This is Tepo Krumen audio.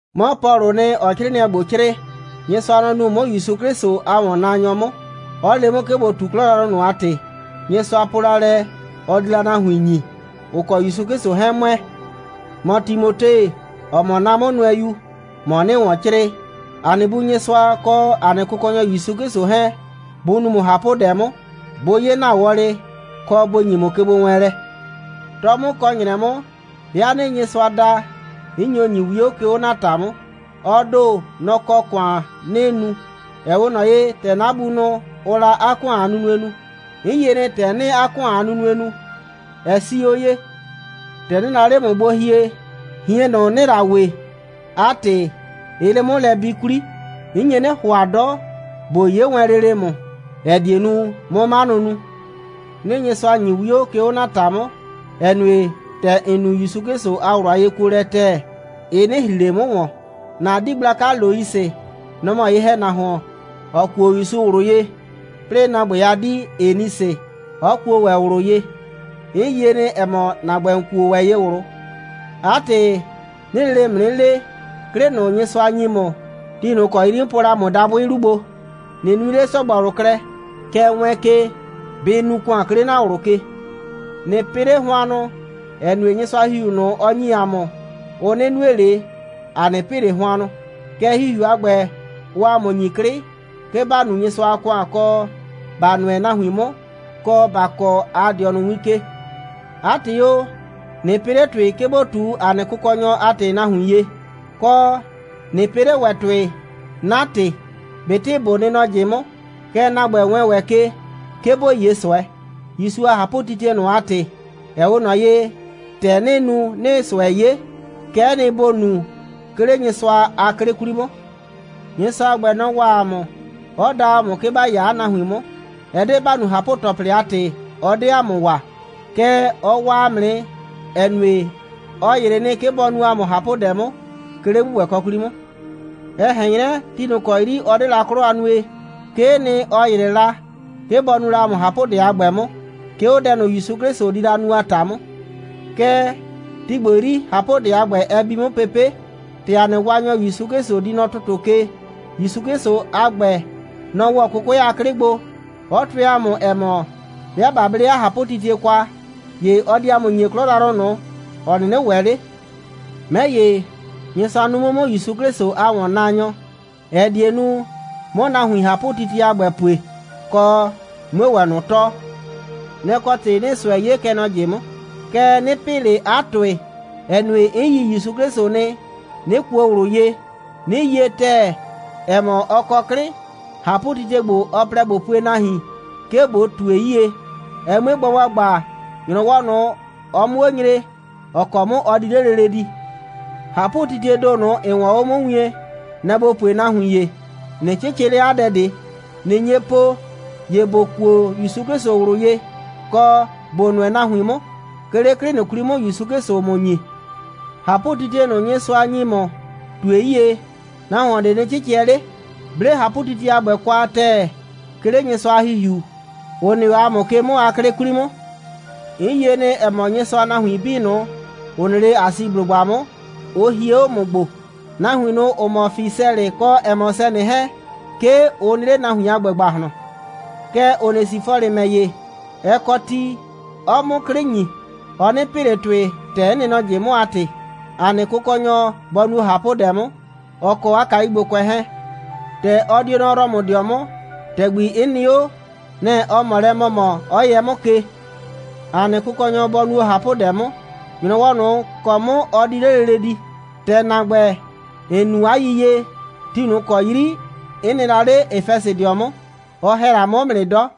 'Mɔ Pɔlʋʋ nɩ, ‑ɔɔ 'crɩɩnɩɛ ‑gbo 'crɩɩ. Nyɩsʋa, nɔ‑ nuu 'mʋ ‑Yusu 'Klɩsʋ a ‑wɔnnaanyɔ 'mʋ, 'ɔ le 'mʋ, 'ke ꞊bo ꞊tu 'klɔ yrayrʋ ꞊nʋ a ‑tɩ, Nyɩsʋa po la lɛ, ɔ di la nahuin ꞊nʋ ‑nyi, ‑ʋ kɔ ‑Yusu 'Klɩsʋ 'hɛɛn ‑mʋɛ. ‑Mɔ Timote, ‑ɔ mɔ 'na 'mʋnʋɛyu, ‑mɔ 'nɩɩ ‑wɔn 'crɩɩ. ‑A nɩ Bu Nyɩsʋa, kɔ ‑a nɩ Kʋkɔnyɔ ‑Yusu 'Klɩsʋ 'hɛɛn, bʋ nu ‑mʋ ꞊hapʋdɛ 'mʋ, bʋ 'ye ‑na wɔlɩ, kɔ, bʋ ‑nyi ‑mʋ kegbowɛɛnlɛ. 'Tɔ 'mʋ kɔ ‑nyrɛ 'mʋ, 'bɩa 'nɩɩ Nyɩsʋa da, 'n nyo ‑nyi 'wio, 'ke 'o ‑na ‑ta 'mʋ. Ɔ ‑do, nɔ‑ kɔ ‑kʋan 'nɩɩ nu, ‑ɛ 'we ꞊nɔ ye, ‑tɛ 'na bunʋ, ʋʋ la 'a ‑kʋan a nunue nu. 'N yie nɩ, ‑tɛ 'nɩɩ 'a ‑kʋan a nunue nu, ɛ 'sii 'o ye. ‑Tɛ 'nɩɩ la 'le ‑mʋ gbo hie, ꞊hien ꞊nʋ, ‑nɩɩ la we, 'a ‑tɩ, ɩɩ 'le 'mʋ lɛ bi 'kwli. 'N nye 'nɩ ‑hʋa 'dɔ, ꞊bo 'ye wɛn lele ‑mʋ, ‑ɛ die nu, 'mʋ 'manʋ nu. 'Nɩɩ Nyɩsʋa ‑nyi 'wio, 'ke 'o ‑na ‑ta 'mʋ, ‑ɛ nue, ‑tɛ ‑n nu ‑Yusu 'Klɩsʋ a ꞊wlʋ a yekuolɛ ‑tɛɛ, ɩ 'nɩ ‑hri ꞊le 'mʋ ‑wɔn. ‑Na 'dii gblaka Loisɩ, nɔ‑ mɔ ye‑hɛnahuon, ‑ɔ kuo ‑Yusu ꞊wlʋ ye, 'plɩɩ ‑na ‑gbɛ a 'dii Enisɩ 'ɔ kuo ‑wɛ ꞊wlʋ ye. 'N yie nɩ, ‑ɛ mɔ, ‑na ‑gbɛ, ‑n kuo ‑wɛ ye ꞊wlʋ. 'A ‑tɩ, 'nɩɩ lele ‑mʋ 'nɩ le, 'klɩ ꞊nʋ, Nyɩsʋa ‑nyi ‑mʋ, ti ꞊nʋ ‑kɔ 'yri 'n po la ‑mʋ dabʋɩ 'lu gbo, ꞊nɩ nui 'le ‑sɔgbɔlʋ klɛ. Kɛɛ, wɛɛn ke, bɩ nu ‑kʋan, 'ke 'le ‑na ꞊wlʋ ke. ꞊Nɩ pɩ 'le hʋannʋ, ‑ɛ nue, Nyɩsʋa a ‑Hihiu ꞊nʋ, ɔ ‑nyi ‑a mʋ, ʋ 'nɩ nue ꞊le, ‑a 'nɩ pɩ ꞊le hʋannʋ. Kɛɛ, ‑Hihiu a ‑gbɛ, ʋʋ ‑a mʋ ‑nyi 'klɩ, 'ke ‑ba nu Nyɩsʋa a ‑kʋan, kɔ, ‑ba nʋɛ nahuin 'mʋ, kɔ, ‑ba kɔɔ ‑a dɩɔnʋ win ke. 'A ‑tɩ o, ꞊nɩ pɩ 'le ‑tʋɩ, 'ke ‑bo ꞊tu ‑a nɩ Kʋkɔnyɔ a ‑tɩ nahuin ye. Kɔ, ꞊nɩ pɩ 'le ‑wɛ ‑tʋɩ 'na ‑tɩ, ꞊betɩ ꞊bo nɩ nɔ ꞊jɩ 'mʋ. Kɛɛ, ‑na ‑gbɛ, wɛɛn ‑wɛ ke, 'ke ‑bo 'ye ꞊sʋɛ, ‑Yusu a ꞊hapʋtitie ꞊nʋ a ‑tɩ, ‑ɛ 'we ꞊nɔ ye, ‑tɛ 'nɩɩ nu, 'nɩɩ ꞊sʋɛ 'ye. Kɛ'ɛ nɩ, ‑bo nu, 'ke 'le Nyɩsʋa a 'klɩ 'kwli 'mʋ. Nyɩsʋa a ‑gbɛ, nɔ‑ waa ‑a mʋ, 'ɔ da ‑a mʋ, 'ke ‑ba 'ya 'a nahuin 'mʋ. Ɛ 'de ‑ba nu ꞊hapʋ‑tɔplɩ a ‑tɩ, ɔ 'de ‑a mʋ waa, kɛɛ, ɔ waa ‑a mʋ nɩ, ‑ɛ nue, ɔ ‑yrɩ nɩ, 'ke bɔ nu ‑a mʋ ꞊hapʋdɛ 'mʋ, 'ke 'le ‑gbʋgbɛkɔ 'kwli 'mʋ. Ɛ ꞊hɛn 'nyrɛ, ti ꞊nʋ ‑kɔ 'yri ɔ 'de la 'klɔ a nue, 'kee nɩ, ɔ ‑yrɩ la, 'ke bɔ nu la ‑a mʋ ꞊hapʋdɛ a ‑gbɛ 'mʋ, 'ke 'o dɛ ꞊nʋ, ‑Yusu 'Klɩsʋ di la nu a ‑ta 'mʋ. Kɛɛ, ti ‑gbo 'yri, ꞊hapʋdɛ a ‑gbɛ, ɛ bi 'mʋ pepe', ‑tɛ ‑a nɩ Waanyɔ ‑Yusu 'Klɩsʋ di nɔ ‑tʋtʋ ke. ‑Yusu 'Klɩsʋ a ‑gbɛ, nɔ‑ ‑wɔ 'kʋkʋɛ a 'klɩ gbo, 'ɔ tʋɛ ‑a mʋ, ‑ɛ mɔ, 'bɩa ꞊ba 'ble 'a ꞊hapʋtitie kwa, ‑ye ɔ di ‑a mʋ ‑nyi 'klɔ yrayrʋ ꞊nʋ, ‑ɔ 'nɩnɩ ‑wɛ 'le. 'Mɛ ‑ye, Nyɩsʋa nuu 'mʋ 'mʋ ‑Yusu 'Klɩsʋ a ‑wɔnnaanyɔ, ‑ɛ die nu, 'mʋ nahuin ꞊hapʋtitie a ‑gbɛ pue, kɔ, 'mue ‑wɛ ꞊nʋ tɔɔ. Nɛ‑ kɔ ‑tɩ 'nɩɩ ꞊sʋɛ 'ye, kɛ nɔ ꞊jɩ 'mʋ. Kɛɛ, 'nɩ pɩ ꞊le 'a ‑tʋɩ, ‑ɛ nue, 'n yi ‑Yusu 'Klɩsʋ nɩ, 'nɩ kuo ꞊wlʋ ye, 'nɩ yie ‑tɛɛ, ‑ɛ mɔ, ɔ kɔ 'klɩ, ꞊hapʋtitie ‑gbo, ɔ plɛ ꞊bo pue nahuin, 'ke bɔ ꞊tue 'yie, ɛ 'mue gba ‑gbagba, ‑nyrɔwɔ ꞊nʋ, ɔ 'mʋ 'o nyre, ‑ɔ kɔ 'mʋ ɔ di 'le lele di. ꞊Hapʋtitiee ‑do ꞊nʋ, ‑n 'wɔɔn 'o 'mʋ wien, nɛ‑ ‑bo pue nahuin ‑ye, ꞊nɩ 'cɩcɩ 'le 'a dɛ ꞊de. ꞊Nɩ nye po, ‑ye ‑bo kuo ‑Yusu 'Klɩsʋ ꞊wlʋ ye, kɔ, ‑bo nʋɛ nahuin 'mʋ, 'ke 'le 'klɩ ꞊nʋ 'kwli 'mʋ, ‑Yusu 'Klɩsʋʋ ‑mʋ ‑nyi. ꞊Hapʋtitie ꞊nʋ, Nyɩsʋa ‑nyi ‑mʋ, ꞊tue 'yie, nahuon ꞊de nɩ 'cɩcɩɛ 'le. 'Ble ꞊hapʋtitie a ‑gbɛ kwa ‑tɛɛ, 'ke 'le Nyɩsʋa a ‑Hihiu, ‑ʋ nɩ 'o ‑a mʋ ke 'mʋ a 'klɩ 'kwli 'mʋ. ‑N yie nɩ, ‑ɛ mɔ, Nyɩsʋa a nahuin 'bii ꞊nʋ, ‑ʋ nɩ 'le Asiblʋgba 'mʋ, ʋ hie 'o 'mʋ gbo. Nahuin ꞊nʋ, ‑ʋ mɔ Fisɛlɩ kɔ Hɛmʋsɛnɩ 'hɛɛn, 'ke ʋ nɩ 'le nahuin a ‑gbɛ ‑gbahlɔn. Kɛɛ, Onesifɔlɩ ‑mɛ ‑ye, ɛ kɔ ti, 'ɔɔ 'mʋ 'klɩ ‑nyi. Ɔ 'nɩ pɩ ꞊le ‑tʋɩ, ‑tɛ 'n nɩ nɔ ꞊jɩ 'mʋ a ‑tɩ. ‑A nɩ Kʋkɔnyɔ bɔ nuo ꞊hapʋdɛ 'mʋ, ɔ kɔ 'a kayugbokʋɛ 'hɛɛn. ‑Tɛ ɔ di o nɔ Rɔmʋdɩɔ 'mʋ, ‑tɛgbi 'n nɩ 'o, nɛ‑ ɔ ꞊mɔ lɛ ‑mɔmɔ, 'ɔ yɛ 'mʋ ke. ‑A nɩ Kʋkɔnyɔ bɔ nuo ꞊hapʋdɛ 'mʋ, ‑nyrɔwɔ ꞊nʋ ‑kɔ 'mʋ ɔ di 'le lele di. ‑Tɛ ‑na ‑gbɛ, ‑n nu 'a yiyie, ti ꞊nʋ ‑kɔ 'yri 'n nɩ la 'le Efɛsɩdɩɔ 'mʋ, ɔ ‑hɛ la 'mʋ 'mʋ nɩ 'dɔ.